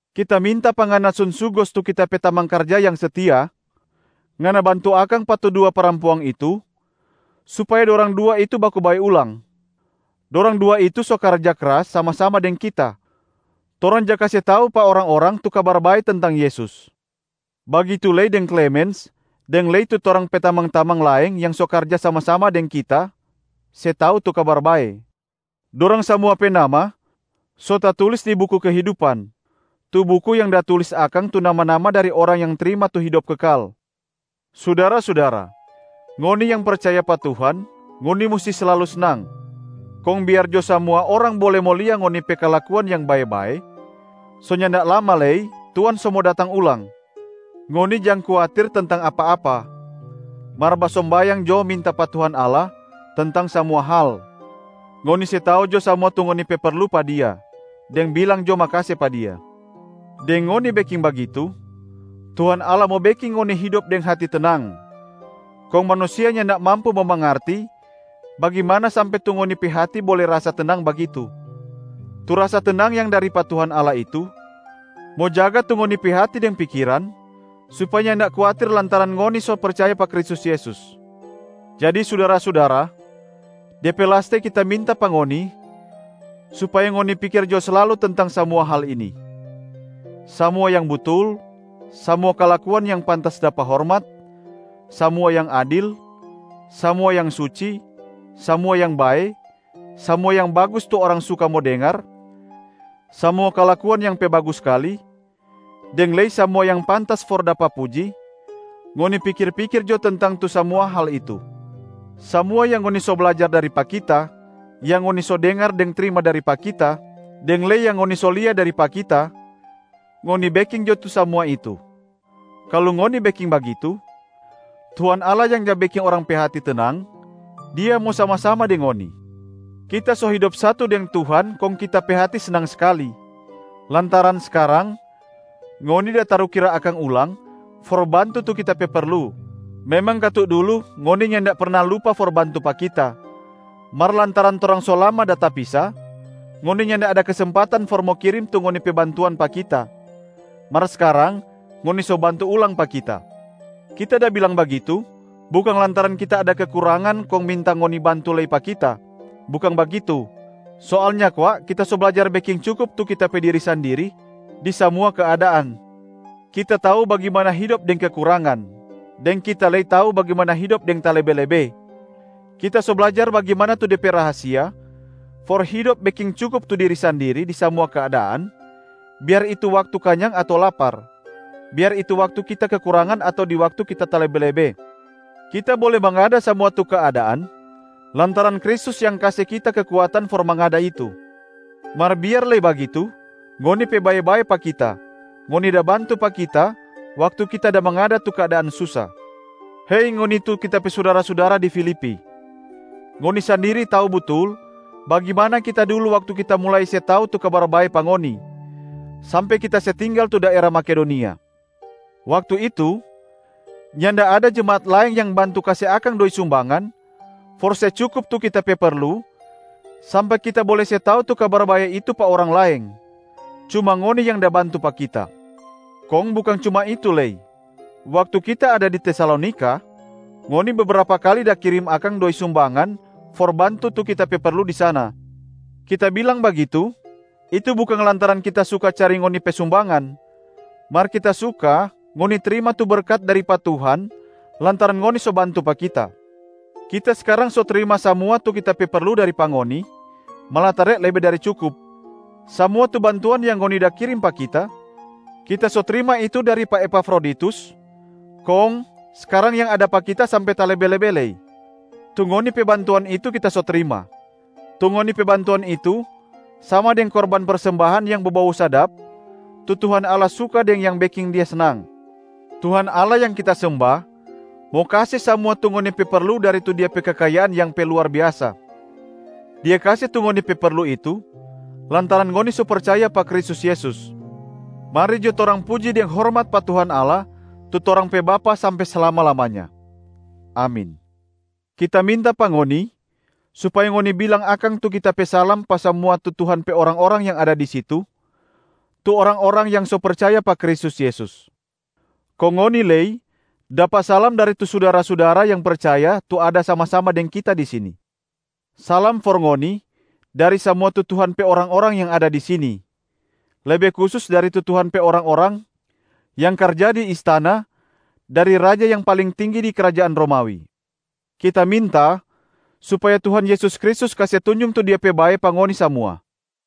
Kita minta pa ngana Sunsugosa tu kita pe tamang karja yang setia, ngana bantu akang pa tu dua parampuang itu supaya dorang dua itu baku bae ulang. Dorang dua itu so karja kras sama-sama deng kita, torang ja kase tau pa orang-orang tu Kabar Bae tentang Yesus. Bagitu lei deng Klemens deng lei tu torang pe tamang-tamang laeng yang so karja sama-sama deng kita se tau tu Kabar Bae. Dorang samua pe nama so tatulis di buku kehidupan, tu buku yang da tulis akang tu nama-nama dari orang yang trima tu hidop kekal. Sudara-sudara, ngoni yang percaya pa Tuhan, ngoni musti slalu snang. Kong biar jo samua orang bole mo lia ngoni pe kalakuan yang bae-bae. So nyanda lama lei Tuhan so mo datang ulang. Ngoni jang kuatir tentang apa-apa, mar basombayang jo minta pa Tuhan Allah tentang samua hal. Ngoni se tau jo samua tu ngoni pe perlu pa Dia, deng bilang jo makase pa Dia. Deng ngoni beking bagitu, Tuhan Allah mo beking ngoni hidop deng hati tenang, kong manusia nyanda mampu mo mangarti bagimana sampe tu ngoni pe hati bole rasa tenang bagitu. Tu rasa tenang yang dari pa Tuhan Allah itu mo jaga tu ngoni pe hati deng pikiran supaya nyanda kuatir lantaran ngoni so percaya pa Kristus Yesus. Jadi sudara-sudara, de pe laste kita minta pa ngoni supaya ngoni pikir jo slalu tentang samua hal ini: samua yang butul, samua kalakuan yang pantas dapa hormat, samua yang adil, samua yang suci, samua yang bae, samua yang bagus tu orang suka mo dengar, samua kalakuan yang pe bagus skali, deng lei samua yang pantas for dapa puji, ngoni pikir-pikir jo tentang tu samua hal itu. Samua yang ngoni so blajar dari pa kita, yang ngoni so dengar deng trima dari pa kita, deng lei yang ngoni so lia dari pa kita, ngoni beking jo tu samua itu. Kalu ngoni beking bagitu, Tuhan Allah yang ja beking orang pe hati tenang, Dia mo sama-sama deng ngoni. Kita so hidop satu deng Tuhan kong kita pe hati snang skali lantaran skarang ngoni da tarukira akang ulang for bantu tu kita pe perlu. Memang katu dulu ngoni nyanda perna lupa for bantu pa kita, mar lantaran torang so lama da tapisa, ngoni nyanda ada kesempatan for mo kirim tu ngoni pe bantuan pa kita, mar skarang ngoni so bantu ulang pa kita. Kita da bilang bagitu bukang lantaran kita ada kekurangan kong minta ngoni bantu lei pa kita, bukang bagitu. Soalnya kwa kita so blajar beking cukup tu kita pe diri sandiri di samua keadaan. Kita tau bagimana hidop deng kekurangan, deng kita lei tau bagimana hidop deng talebe-lebe. Kita so blajar bagimana tu de pe rahasia for hidop beking cukup tu diri sandiri di samua keadaan, biar itu waktu kanyang ato lapar, biar itu waktu kita kekurangan ato di waktu kita talebe-lebe. Kita bole mangada samua tu keadaan lantaran Kristus yang kase kita kekuatan for mangada itu. Mar biar lei bagitu ngoni pe bae-bae pa kita, ngoni da bantu pa kita waktu kita da mangada tu keadaan susa. Hei ngoni tu kita pe sudara-sudara di Filipi, ngoni sandiri tau butul bagimana kita dulu waktu kita mulai se tau tu Kabar Bae pa ngoni, sampe kita se tinggal tu daera Makedonia. Waktu itu, nyanda ada jemaat laeng yang bantu kase akang doi sumbangan for se cukup tu kita pe perlu sampe kita bole se tau tu Kabar Bae itu pa orang laeng, cuma ngoni yang da bantu pa kita. Kong bukang cuma itu lei, waktu kita ada di Tesalonika, ngoni bebrapa kali da kirim akang doi sumbangan for bantu tu kita pe perlu di sana. Kita bilang bagitu, itu bukang lantaran kita suka cari ngoni pe sumbangan, mar kita suka ngoni trima tu berkat dari pa Tuhan lantaran ngoni so bantu pa kita. Kita skarang so trima samua tu kita pe perlu dari pa ngoni, malatare lebe dari cukup. Samua tu bantuan yang ngoni da kirim pa kita, kita so trima itu dari pa Epafroditus kong skarang yang ada pa kita sampe talebe-lebe lei. Tu ngoni pe bantuan itu kita so trima. Tu ngoni pe bantuan itu sama deng korban persembahan yang bobou sadap, tu Tuhan Allah suka deng yang beking Dia snang. Tuhan Allah yang kita semba mo kase samua tu ngoni perlu dari tu Dia pe kekayaan yang pe luar biasa. Dia kase tu ngoni pe perlu itu lantaran ngoni so percaya pa Kristus Yesus. Mari jo torang puji deng hormat pa Tuhan Allah tu torang pe Bapa sampe slama-lamanya! Amin. Kita minta pa ngoni supaya ngoni bilang akang tu kita pe salam pa samua Tuhan pe orang-orang yang ada di situ, tu orang-orang yang so percaya pa Kristus Yesus. Kong ngoni lei dapa salam dari tu sudara-sudara yang percaya tu ada sama-sama deng kita di sini. Salam for ngoni dari samua tu Tuhan pe orang-orang yang ada di sini, lebe kusus dari tu Tuhan pe orang-orang yang karja di istana dari raja yang paling tinggi di krajaan Romawi. Kita minta supaya Tuhan Yesus Kristus kase tunjung tu Dia pe bae pa ngoni samua.